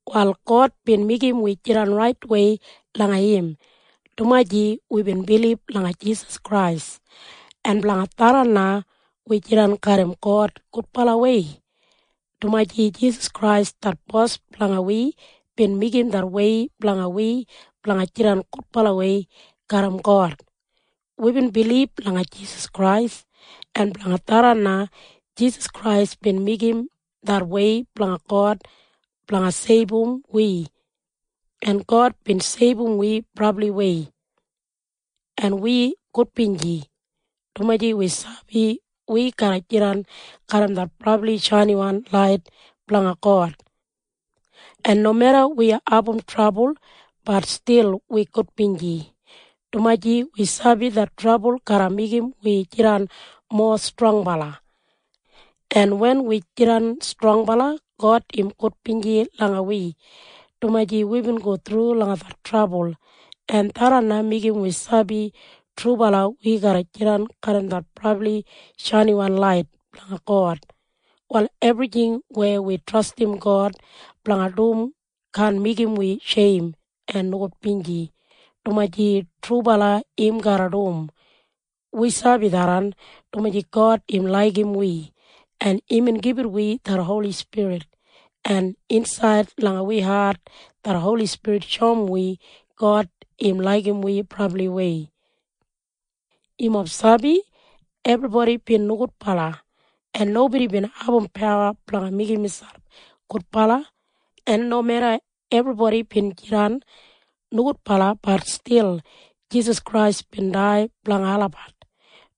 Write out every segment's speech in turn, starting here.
Wal God bin meigim wi jidan raitwei langa im dumaji wibin bilib langa Jisas Krais, en blanga tharran na wi jidan garram God gudbalawei, dumaji Jisas Krais det Bos blanga wi bin meigim det wei blanga wi blanga jidan gudbalawei garram God. Wibin bilib langa Jisas Krais, en blanga tharran na Jisas Krais bin meigim det wei blanga God blanga seibum wi, en God bin seibum wi brabliwei. En wi gudbinji, dumaji wi sabi wi garra jidan garram det brabli shainiwan lait blanga God. En nomeda wi abum trabul, bat stil wi gudbinji, dumaji wi sabi det trabul garra meigim wi jidan mowa strongbala. En wen wi jidan strongbala, God im gudbinji langa wi, dumaji wibin go thru langa det trabul, en tharran na meigim wi sabi trubala wi garra jidan garram det brabli shainiwan lait blanga God. Wal ebrijing weya wi trastim God blanga dum kaan meigim wi sheim en nogudbinji, dumaji trubala im garra dum. Wi sabi tharran, dumaji God im laigim wi, en imbin gibit wi det Holi Spirit, en insaid langa wi hat det Holi Spirit shoum wi God im laigim wi brabliwei. Yumob sabi? Ebribodi bin nogudbala, en nobodi bin abum pawa blanga meigim miselp gudbala. En nomeda ebribodi bin jidan nogudbala, bat stil Jisas Krais bin dai blanga olabat,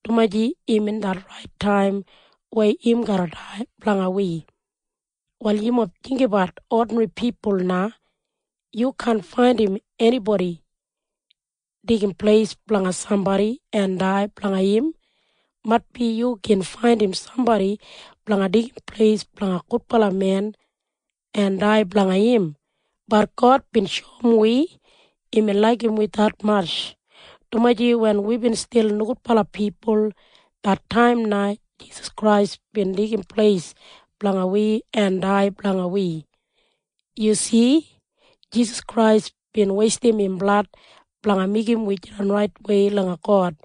dumaji imbin det rait taim weya im garra dai blanga wi. Wal yumob jinggabat odinri pipul na. Yu kaan faindim enibodi deigim pleis blanga sambodi en dai blanga im. Maitbi yu gin faindim sambodi blanga deigim pleis blanga gudbala men en dai blanga im. Bat God bin shoum wi imbin laigim wi detmatj, dumaji wen wibin stil nogudbala pipul, det taim na Jisas Krais bin deigim pleis blanga wi en dai blanga wi. Yu si? Jisas Krais bin weistim im blad blanga meigim wi jidan raitwei langa God.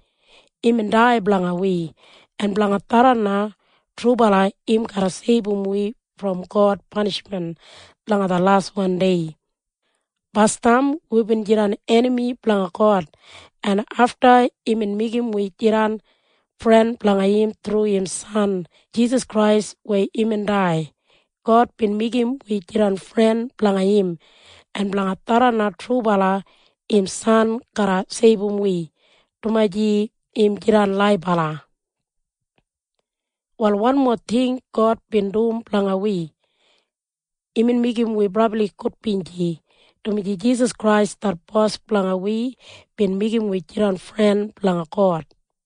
Imbin dai blanga wi, en blanga tharran na trubala im garra seibum wi brom God panishmen langa det laswan dei. Basdam wibin jidan enami blanga God, en afta imbin meigim wi jidan fren blanga im thru im San Jisas Krais weya imbin dai. God bin meigim wi jidan fren blanga im, en blanga tharran na trubala im San garra seibum wi, dumaji im jidan laibala. Wal wanmo ting God bin dum blanga wi. Imbin meigim wi brabli gudbinji, dumaji Jisas Krais det Bos blanga wi bin meigim wi jidan fren blanga God.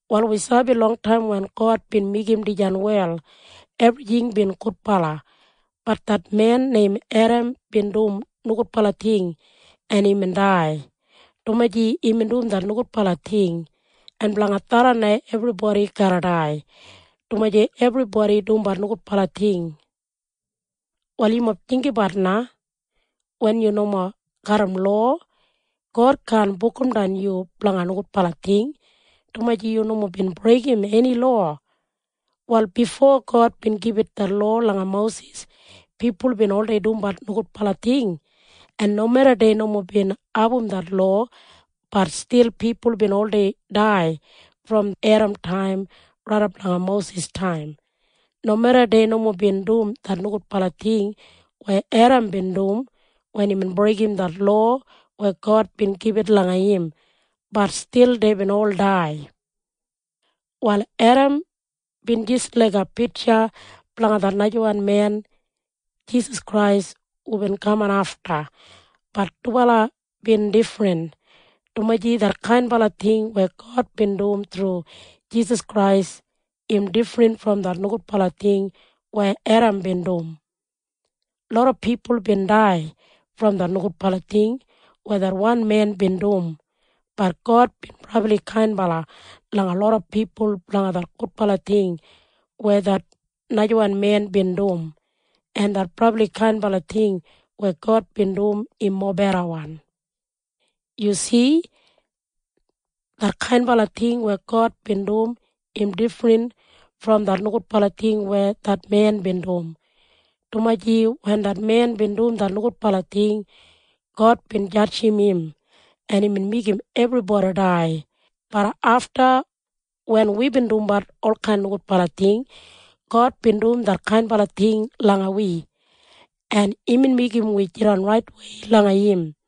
Wal wi sabi longtaim wen God bin meigim dijan wel, ebrijing bin gudbala. Bat det men neim Edam bin dum nogudbala ting, en imbin dai, dumaji imbin dum det nogudbala ting. En blanga tharran na ebribodi garra dai, dumaji ebribodi dumbat nogudbala ting. Wal yumob jinggabat na. Wen yu nomo garram lowa, God kaan bukumdan yu blanga nogudbala ting, dumaji yu nomo bin breigim eni lowa. Wal bifo God bin gibit det lowa langa Mosis, pipul bin oldei dumbat nogudbala ting, en nomeda dei nomo bin abum det lowa, bat stil pipul bin oldei dai brom Edamtaim raidap langa Mosistaim. Nomeda dei nomo bin dum det nogudbala ting weya Edam bin dum wen imbin breigim det lowa weya God bin gibit langa im, bat stil deibin ol dai. Wal Edam bin jis laiga pitja blanga det najawan men Jisas Krais hubin kaman afta. Bat dubala bin difrin, dumaji detkain ting weya God bin dum thru Jisas Krais im difrin brom det nogudbala ting weya Edam bin dum. Loda pipul bin dai brom det nogudbala ting weya det wan men bin dum. Bat God bin brabli kainbala langa loda pipul blanga det gudbala ting weya det najawan men bin dum. En det brabli kainbala ting weya God bin dum im mobedawan. Yu si? Detkain ting weya God bin dum im difrin brom det nogudbala ting weya det men bin dum, dumaji wen det men bin dum det nogudbala ting, God bin jadjim im, en imbin meigim ebribodi dai. Bat afta wen wibin dumbat olkain nogudbala ting, God bin dum detkain ting langa wi, en imbin meigim wi jidan raitwei langa im.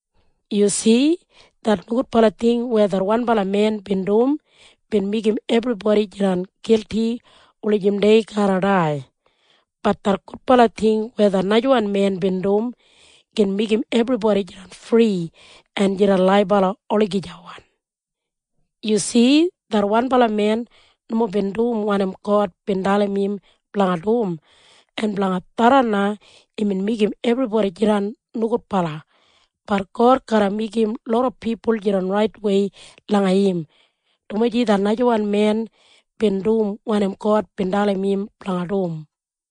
Yu si? Det nogudbala ting weya det wanbala men bin dum bin meigim ebribodi jidan gilti wulijim dei garra dai. Bat det gudbala ting weya det najawan men bin dum gin meigim ebribodi jidan fri en jidan laibala olagijawan. Yu si? Det wanbala men nomo bin dum wanim God bin dalim im blanga dum, en blanga tharran na imbin meigim ebribodi jidan nogudbala. Bat God garra meigim loda pipul jidan raitwei langa im, dumaji det najawan men bin dum wanim God bin dalim im blanga dum.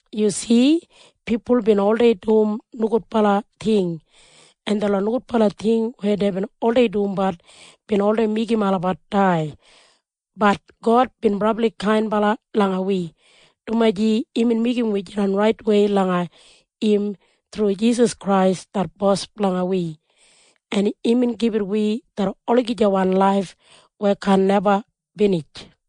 Yu si? Pipul bin oldei dum nogudbala ting, en detlot nogudbala ting weya deibin oldei dumbat bin oldei meigim olabat dai. Bat God bin brabli kainbala langa wi, dumaji imbin meigim wi jidan raitwei langa im thru Jisas Krais det Bos blanga wi, en imbin gibit wi det olagijawan laif weya kaan neba binij.